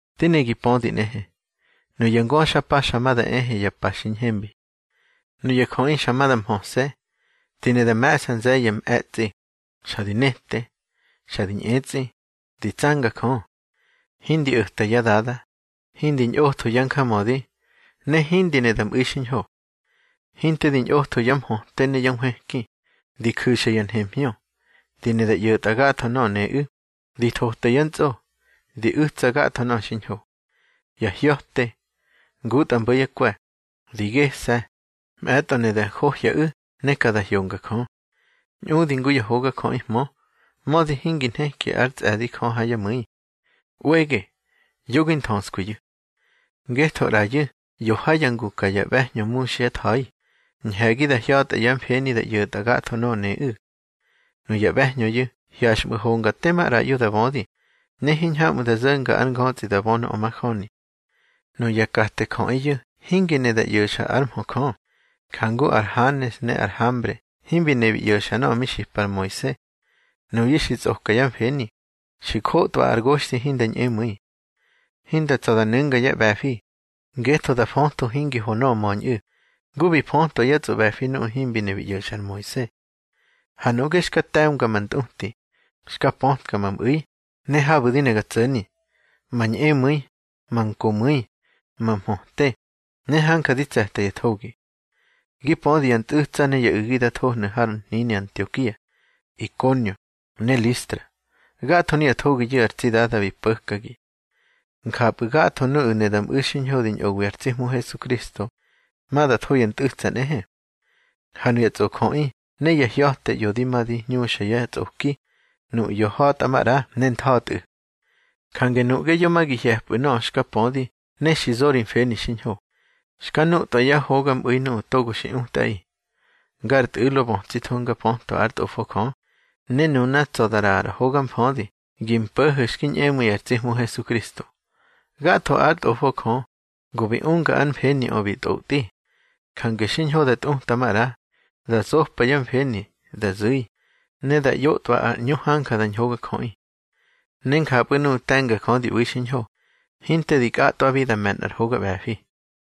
Di ne gi pödi nꞌehe, nuya ngöxpa xa ma da ehe ya pa xiñhembi. Nuya jöꞌi xa ma da mhöse̱, di ne da me̱ꞌsa nze̱ye̱ ya mꞌe̱tsꞌi, xa di nete, xa di ñꞌetsꞌi, di tsanga Jö. Hindi o̱ta yá dada, hindi ñꞌotho yá njamödi, ne hindi ne da mꞌu̱i xiñho. Hinte di ñꞌotho yá mhöte ne yá nhwëki, di ju̱xa ya nhemhñö, di ne da ꞌyo̱tꞌa gatho nöꞌö neꞌu̱, di thota yá ntsꞌo, di u̱tsa gatho nöꞌö xiñho. Ya hya̱te, ngutꞌa mbo̱ yá kwe̱, di gese̱, mꞌe̱tꞌo ne da njohyaꞌu̱ ne ka da hyonga Jö. Ñꞌudi ngu ya hogajöꞌihmö, mödi hingi nheki ár tsꞌe̱di Jö ha yá mu̱i. ꞌWege, yo gi nthöskwiyu̱. Ngetho ꞌrayu̱ ꞌyo ha ya ngu ka ya ꞌbe̱hñö muxyá tha̱i, ñhe̱gi da hya̱tꞌa yá mfeni da ꞌyo̱tꞌa gatho nöꞌö neꞌu̱. Nuya ꞌbe̱hñöyu̱ hyaxꞌmu̱ honga tema ꞌraꞌyo da bödi, ne hiñhamꞌu̱ da zo̱nga ár ngötsꞌi da bö nöꞌö majöni. Nuya kate jöꞌiyu̱ hingi ne da ꞌyo̱xa ár mhö Jö, jangu ar Hanes ne ar Hambre himbi ne bi ꞌyo̱xa nöꞌö mi xipa ar Moise. Nuyu̱ xi tsꞌoka yá mfeni, xi njotꞌwa ar goxthi hinda ñꞌemu̱i. Hinda tsa̱ da nu̱nga yá ꞌbe̱fi, ngetho da fötho hingi ho nöꞌö möñꞌu̱, ngu bi fötwa yá tsꞌoꞌbe̱fi nuꞌu̱ himbi ne bi ꞌyo̱xa ar Moise. Ha nuꞌge xka te̱mga ma ntꞌuti, xka pötka ma mꞌu̱i ne habu̱ di ne ga tso̱ni, ma ñꞌemu̱i, ma nkomu̱i, ma mhöte, ne hanja di tse̱ta ya thogi. Gi pödi ya ntꞌu̱tsa ne ya u̱gi da thohnu̱ har hnini Antiokia, Ikonio, ne Listra. Gatho nuya thogiyu̱ ar tsi Dada bi po̱kagi. Njapꞌu̱ gatho nuꞌu̱ ne da mꞌu̱ xiñho di ñꞌowi ar tsi Hmu Hesukristo, ma da tho ya ntꞌu̱tsa nꞌehe. Ha nuya tsꞌojöꞌi ne ya hya̱te ꞌyo di ma di hñuxa yá tsꞌoki, nuꞌu̱ ꞌyo ha̱tꞌa maꞌra ne ntha̱tꞌu̱. Jange nuꞌge yo ma gi hye̱pꞌu̱ nöꞌö xka pödi ne xi zo ri mfeni xiñho, xka nutꞌwa yá hogamꞌu̱i nuꞌu̱ togo xi utꞌaꞌi. Ngar tꞌu̱lo bötsitho nga pötwa ár Tꞌofo Jö, ne nuna tsa̱ da ꞌraꞌa ar hoga mfödi gi mpo̱ho̱ xki ñꞌemu̱i ar tsi Hmu Hesukristo. Gatho ár Tꞌofo Jö, go bi unga ar mfeniꞌö bi tꞌotꞌi. Jange xiñho da tꞌuta maꞌra, da zopa yá mfeni, da zu̱i, ne da ꞌyotꞌwa ar ꞌñu hanja da ñhogajöꞌi. Ne njapꞌu̱ nuꞌu̱ te̱nga Jö di ꞌbu̱i xiñho, hinte di kꞌatꞌwabi da me̱ nꞌar hoga ꞌbe̱fi.